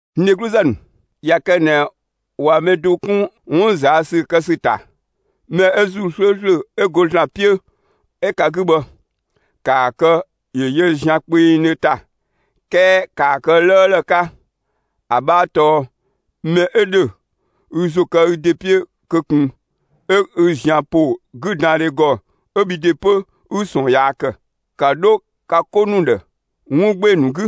N dhegluzë ‑nu, ꞊ya kë ꞊nɛ ꞊wa mɛ do 'kun 'wun ꞊zaa' ‑sü kë ‑sü ‑ta, mɛ 'ö ‑Zuu 'slööslö 'ö go ‑Zlan 'piö 'ö ka 'gü bhë, ‑kaa kë ‑yö yö zian kpengdhö ‑ta; 'kɛɛ ‑kaa kë 'lëëlë 'ka. ‑A 'bhaa tɔɔ: Mɛ 'ü ‑dhö, ü ‑zo kë ü ‑de 'piö kö ꞊kun 'ö 'ü zian ‑po 'güdandhe ‑gɔ 'ö bhi ‑de 'pö, 'ü ꞊sɔɔn yaa ‑kë. ‑Ka 'dho ka 'ko ‑nu ‑dhë 'wun 'gbee‑ ‑nu 'gü;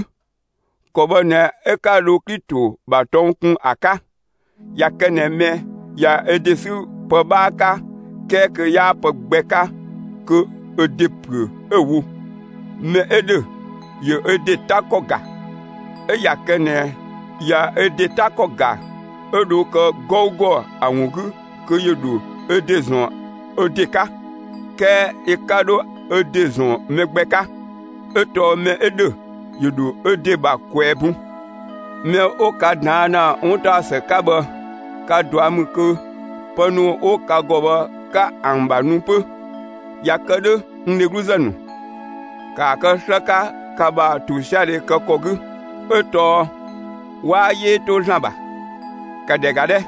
‑kɔ bhë ꞊nɛ 'ö 'ka dho Klito ‑bha tɔng kun ‑a 'ka. ꞊Ya kë ꞊nɛ mɛ ꞊ya ö ‑de sü pë 'bhaa 'ka 'kɛɛ kö 'yaa pë gbɛ 'ka, kö ö ‑de ‑püö 'ö‑ wo. Mɛ 'ö ‑dhö, ‑yö ö ‑de 'ta ‑kɔ ‑ga; 'ö ꞊ya kë ꞊nɛ ꞊ya ö ‑de 'ta ‑kɔ ‑ga 'ö dho kë 'gɔugɔ ‑a ‑wun 'gü kö ‑yö ‑dho ö ‑de ‑zɔn ö ‑de 'ka, 'kɛɛ yö 'ka 'dho ö ‑de ‑zɔn mɛ gbɛ 'ka; 'ö tɔɔ mɛ 'ö ‑dhö, ‑yö ‑dho ö ‑de ‑bha ꞊kwɛɛ‑ bun. Mɛ 'ö 'wo ka ꞊daan' ‑na 'wuntaɔsë 'ka bhë, kwa ꞊dua' ‑mü kö pë ‑nu 'wo ka ‑gɔ bhë, 'ka ‑an ‑bha nu 'pö. ꞊Ya kë 'dhö, (n dhegluzë ‑nu), ‑kaa kë 'slë 'ka ka ‑bha ‑tosiadhe kë ‑kɔ 'gü; 'ö tɔɔ 'waa 'yee 'to ‑Zlan ‑bha. ‑Ka ‑dhɛ ‑ga 'dhɛ!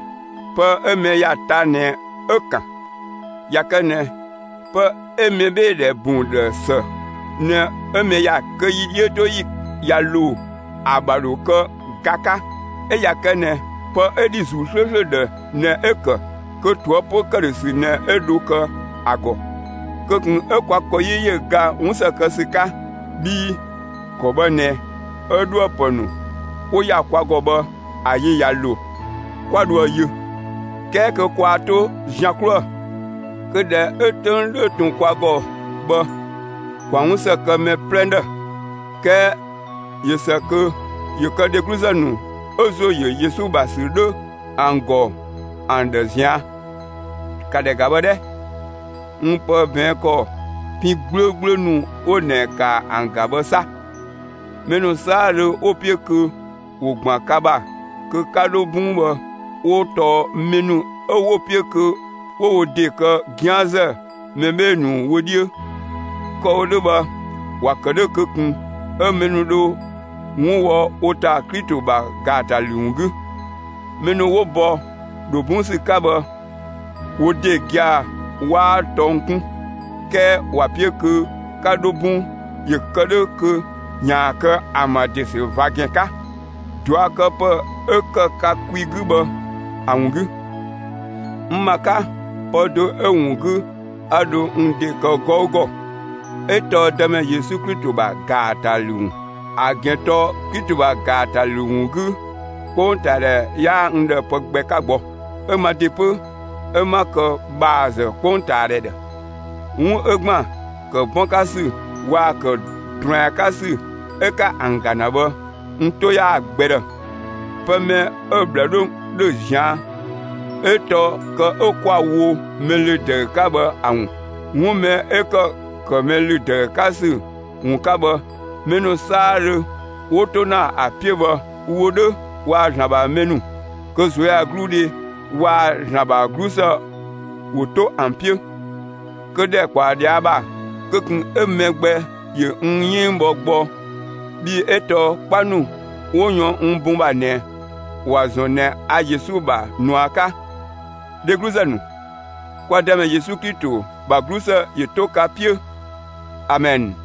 Pë 'ö mɛ ‑ya ta ꞊nɛ 'ö‑ ‑kan. ꞊Ya kë ꞊nɛ pë 'ö mɛbheedhɛ bun ‑dhë ‑së ꞊nɛ 'ö mɛ ‑ya ‑kë, kö yi 'dhiötoyi ꞊ya ‑lo, ‑a ‑bha ‑dho kë ga 'ka; 'ö ꞊ya kë ꞊nɛ pë 'ö ‑dhi ‑Zuu 'slööslö ‑dhë ꞊nɛ 'ö‑ ‑kë, kö ꞊toëpö ‑këdhösü ꞊nɛ 'ö dho kë ‑a ‑gɔ. Kö ꞊kun 'ö kwa ‑kɔ 'yi ‑yö ga 'wun ‑së kë ‑sü 'ka. Bhii ‑kɔ bhë ꞊nɛ 'ö 'dhuë‑ ‑pë ‑nu 'wo ‑ya kwa ‑gɔ bhë ‑a yi ꞊ya ‑lo, 'kwa dhoë‑ yö; 'kɛɛ kö kwaa 'to zian 'kluë‑. Kö ꞊dhɛ 'ö 'töng 'dhö ꞊tun kwa ‑gɔ bhë, ‑kwa 'wunsë kë mɛ 'plɛ ‑dhë; 'kɛɛ ꞊yö ‑së kö ‑yö kë dhegluzë ‑nu 'ö ‑zo ‑yö Yesu ‑bha ‑sü 'dhö ‑an ‑gɔ ‑an ꞊zian'. ‑Ka ‑dhɛ ‑ga bhë 'dhɛ! N pë ꞊bɛɛn' ‑kɔ pin 'gblöögblöö ‑nu 'wo ꞊nɛ ‑ka ‑an ‑ga bhë 'sa! Mɛ ‑nu 'saadhö 'wo‑ 'piö kö ‑wo ‑gban ka ‑bha kö 'ka 'dho 'bɔng bhë, 'wo tɔɔ mɛ ‑nu 'ö 'wo‑ 'piö kö 'wo wo ‑de kë 'gianzë mɛ 'bhee‑ ‑nu wö 'dhiö. Kë‑ wo 'dhö bhë ‑wa ‑kë 'dhö kö ꞊kun 'ö mɛ ‑nu dho 'wun wɔ wo ‑ta Klito ‑bha ‑gaatalü ‑wun 'gü. Mɛ ‑nu 'wo bɔ ‑dho 'bɔng ‑sü 'ka bhë wo ‑de gia‑ 'waa tɔng 'kun; 'kɛɛ ‑wa 'piö kö 'ka 'dho 'bɔng ‑yö kë 'dhö kö ‑yaan kë ‑an ‑bha ‑de ‑sü ꞊va ‑gɛn 'ka, ꞊duakëpë 'ö ‑kë ka kwi 'gü bhë ‑a ‑wun 'gü. N ‑ma 'ka, pë do 'ö‑ ‑wun 'gü 'a dho n ‑de kë 'gɔugɔ, 'ö tɔɔ Dëmɛ Yesu Klito ‑bha ‑gaatalü ‑wun. ‑A ‑gɛn tɔɔ Klito ‑bha ‑gaatalü ‑wun 'gü, 'kpongtaadhɛ 'yaa n ‑dhë pë gbɛ 'ka gbɔ. 'Ö ma ‑de 'pö, 'ö 'ma kë ‑bhaazë 'kpongtaadhɛ ‑dhë. 'Wun 'ö ‑gban ‑kë 'bɔn 'ka ‑sü waa‑ ‑kë ꞊druɛn 'ka ‑sü 'ö 'ka ‑an ‑ga ‑na bhë, n 'to 'yaa‑ gbɛ ‑dhë; pë mɛ 'ö‑ ꞊bhlë 'dhö ‑dhö ꞊zian' 'ö tɔɔ kë 'ö 'kwa‑ wo mɛ ‑lü ‑dëü 'ka bhë ‑a ‑wun. 'Wun mɛ 'ö ‑kë ‑kë mɛ ‑lü ‑dëü 'ka ‑sü ‑wun 'ka bhë, mɛ ‑nu 'saadhö 'wo 'to ‑na ‑a 'piö bhë, wo 'dhö waa‑ ‑Zlan ‑bha mɛ ‑nu, kö ꞊zuöyagluudhe waa‑ ‑Zlan ‑bha 'glusë ‑wo 'to ‑an 'piö! Kö ‑dhɛ ꞊kpaɔ ꞊dhia' ‑bha, kö ꞊kun 'ö mɛ gbɛ ‑yö n 'yënng bhɔ gbɔ bhii 'ö tɔɔ 'kpa ‑nu 'wo yɔn n bun ‑bha ꞊nɛ, ‑wa ‑zɔn ꞊nɛ a Yesu ‑bha ꞊nua 'ka. Dhegluzë ‑nu, kwa Dëmɛ Yesu Klito ‑bha 'glusë ‑yö 'to ka 'piö! Amɛn.